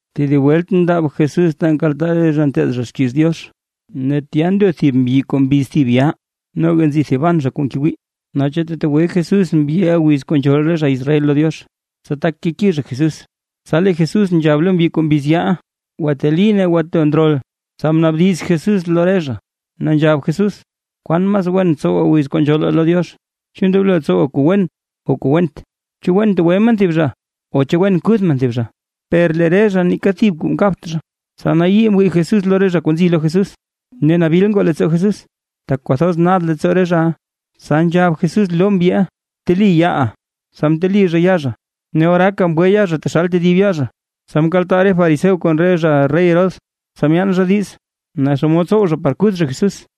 Tedib welt mndaab Jesús ta nkaltaa re zha nteed zha xkiiz Diox, ne tya ndo thib mbyi kuu mbiz thib yaa. Noga nzi thiban zha kuu ngewii, naa chu tetegwe Jesús mbyiʼa wiz kuu nzhool re zha Israel lo Diox, tsa tak keki zha Jesús. Tsa lee Jesús nzhab lo mbyi kuu mbiz yaaʼa: ―Gwateli, ne bto ndrol. Tsa mnaabdiz Jesús lo re zha, ne nzhab Jesús: ―¿Kwan mas wen tsowaa wiz kuu nzhoolaa lo Diox? ¿Chu ndoblo tsowaa kuu wen o kuu went? ¿Chu wen tegwe men thib zha, o chu wen kuth men thib zha? Per lee re zha neeka thib kuu mkabt zha. Tsa nayii mwii Jesús lo re zha kuu nzi lo Jesús: Ne nabil ngoo leettsoo Jesús, tak kwathoz nad leettsoo re zhaʼa, tsa nzhab Jesús lo mbyiʼa: ―Bteli yaaʼa. Tsa mteli zha yaa zha, ne oraaka mgwe yaa zha taxal tedib yaa zha. Tsa mkaltaa re fariseo kon re zha rey Herodes, tsa myaan zha diiz, naa xomod tsow zha par kuth zha Jesús.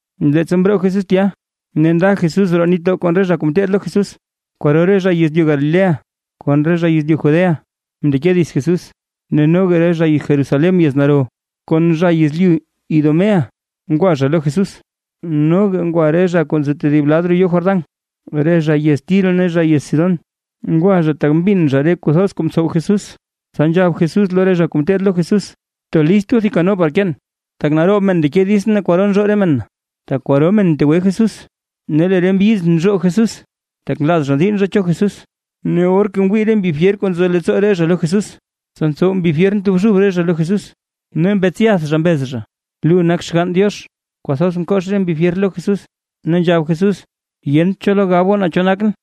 Leettsa mroo Jesús tya ne nda Jesús roo nitdoo kon re zha kuu ngeteed lo Jesús, kwaro re zha yezlyu Galilea kon re zha yezlyu Judéa, mndeke dits Jesús. Ne noga re zha Jerusalén yez naro, kon zha yezlyu Idumea ngwa lo Jesús; noga ngwa re zha kuu nzo tedib lad roo yoo Jordán, re zha yez Tiro ne zha yez Sidón. Ngwa zha tak mbin zha re kuu thoz kuu ntsow Jesús. Tsa nzhab Jesús lo re zha kuu ngeteed lo Jesús: ―Btolist goo thib kano par keen, tak naroob men ndeke ditsʼn ne kwaro nzhoo re men na. Tak kwaro men mtegwe Jesús, ne lee re mbyiz nzhoo Jesús, tak nlaaz zha diinn zha cho Jesús. Ne or ngwii re mbi fyer kuu nzo leettsoo re zha lo Jesús, tsa ntsow mbi fyer ntobxub re zha lo Jesús, ne mbetsyath zha mbez zha: ―Lu nak Xgann Diox. Kwathoz mkox re mbi fyer lo Jesús, ne nzhab Jesús: ―Yent cho lo gab goo naa cho nakʼn.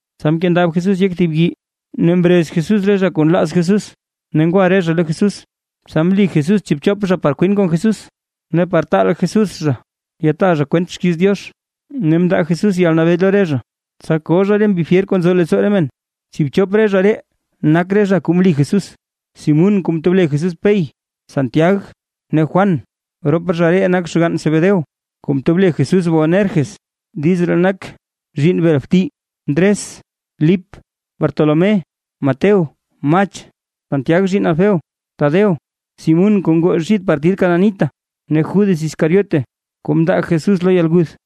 Tsa mkendab Jesús yek thib yii, ne mrez Jesús re zha kuu nlaaz Jesús, ne ngwa re zha lo Jesús. Tsa mli Jesús tsiibchop zha par kwin kon Jesús, ne par taal Jesús zha yataa zha kwent xkiiz Diox. Ne mndaa Jesús yalnabee lo re zha, tsa koo zha re mbi fyer kuu nzo leettsoo re men. Tsiibchop re zha ree nak re zha kuu mli Jesús: Simún (kuu mtob le Jesús Pey), Santiag ne Juan (rop zha ree nak xgann Zebedeo, kuu mtob le Jesús Boanerges, diiz ree nak: “Zhiinn bel bti”); Ndres, Lip, Bartolomé, Mateo, Mach, Santiag (zhiinn Alfeo), Tadeo, Simún (kuu ngoo xid partid Cananita), ne Judas Iscariote (kuu mndaa Jesús lo yalguth).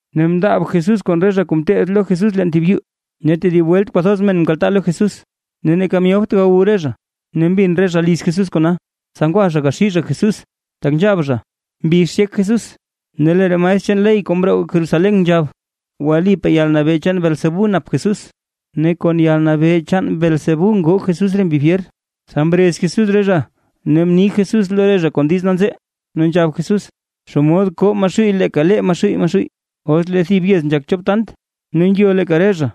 Ne mndaab Jesús kon re zha kuu ngeteed lo Jesús leen thib yuu, ne tedib welt kwathoz men mkaltaa lo Jesús, ne neeka myobt gawu re zha. Ne mbin re zha liz Jesús kona, tsa ngwa zha gaxii zha Jesús, tak nzhab zha: ―Mbix yek Jesús. Ne lee re maestr chaan ley kuu mroo Jerusalén nzhab: ―Wlipaa yalnabee chaan Beelzebú nap Jesús, ne kon yalnabee chaan Beelzebú ngoo Jesús re mbi fyer. Tsa mrez Jesús re zha ne mni Jesús lo re zha kon diiz nanzee, ne nzhab Jesús: ―¿Xomod koo Maxuuy leeka lee Maxuuy Maxuuy? Os lee thib yez nzhak chop tant ne ngyo leeka re zha,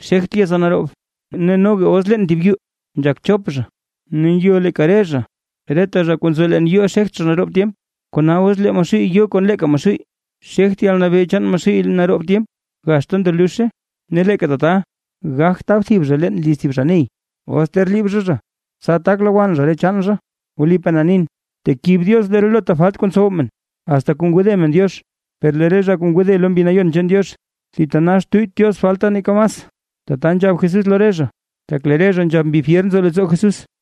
xegt yeza naroob. Ne noga os leen thib yuu nzhak chop zha, ne ngyo leeka re zha, reta zha kuu nzo leen yuuʼa xegt zha naroob tyemp. Kona os lee Maxuuy yo kon leeka lee Maxuuy, xegt yalnabee chaan Maxuuy naroob tyemp, gaxta ndo luzhe. ’Ne leeka tata gagt tab thib zha leen liz thib zha ney, os ter liib zha zha, tsa tak lowann zha re chaan zha. ’Wlipaa na nin, tekib Diox relota falt kuu ntsow men, asta kuu ngode men Diox. Per lee re zha kuu ngode lo Mbi Nayon chaan Diox, thitanax tuyyt Diox falta neeka mas. Tata nzhab Jesús lo re zha, tak lee re zha nzhab mbi fyer nzo leettsoo Jesús.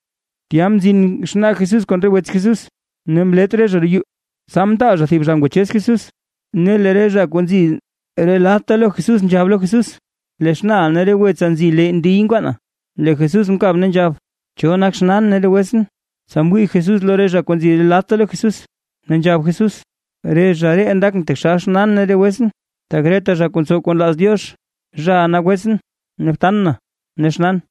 Tya mzin xnaa Jesús kon re wets Jesús, ne mlet re zha roo yuu, tsa mtaal zha thib zha ngwachez Jesús. Ne lee re zha kuu nzi re ladta lo Jesús nzhab lo Jesús: ―Lee xnaaʼa ne re wetsa nzi lee ndiy nkwaana. Lee Jesús mkab ne nzhab: ―¿Cho nak xnaan ne re wetsʼn? Tsa mwii Jesús lo re zha kuu nzi re ladta lo Jesús, ne nzhab Jesús: ―Re zha ree ndakʼn taxal xnaan ne re wetsʼn. Tak reta zha kuu ntsow kuu nlaaz Diox, zhaʼa nak wetsʼn, btan na ne xnaan.